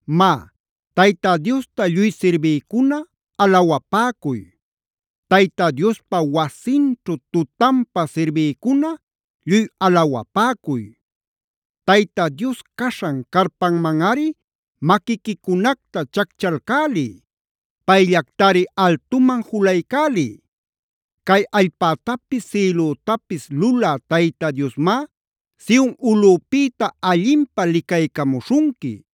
Má, Tayta Diosta lluy sirbïcuna alawapäcuy. Tayta Diospa wasinćhu tutanpä sirbïcuna lluy alawapäcuy. Tayta Dios caśhan carpamanꞌari maquiquicunacta chacchalcäliy. Payllactari altuman julaycäliy. Cay allpätapis sïlütapis lulä Tayta Diosmá Sion ulꞌupïta allinpä licaycamuśhunqui.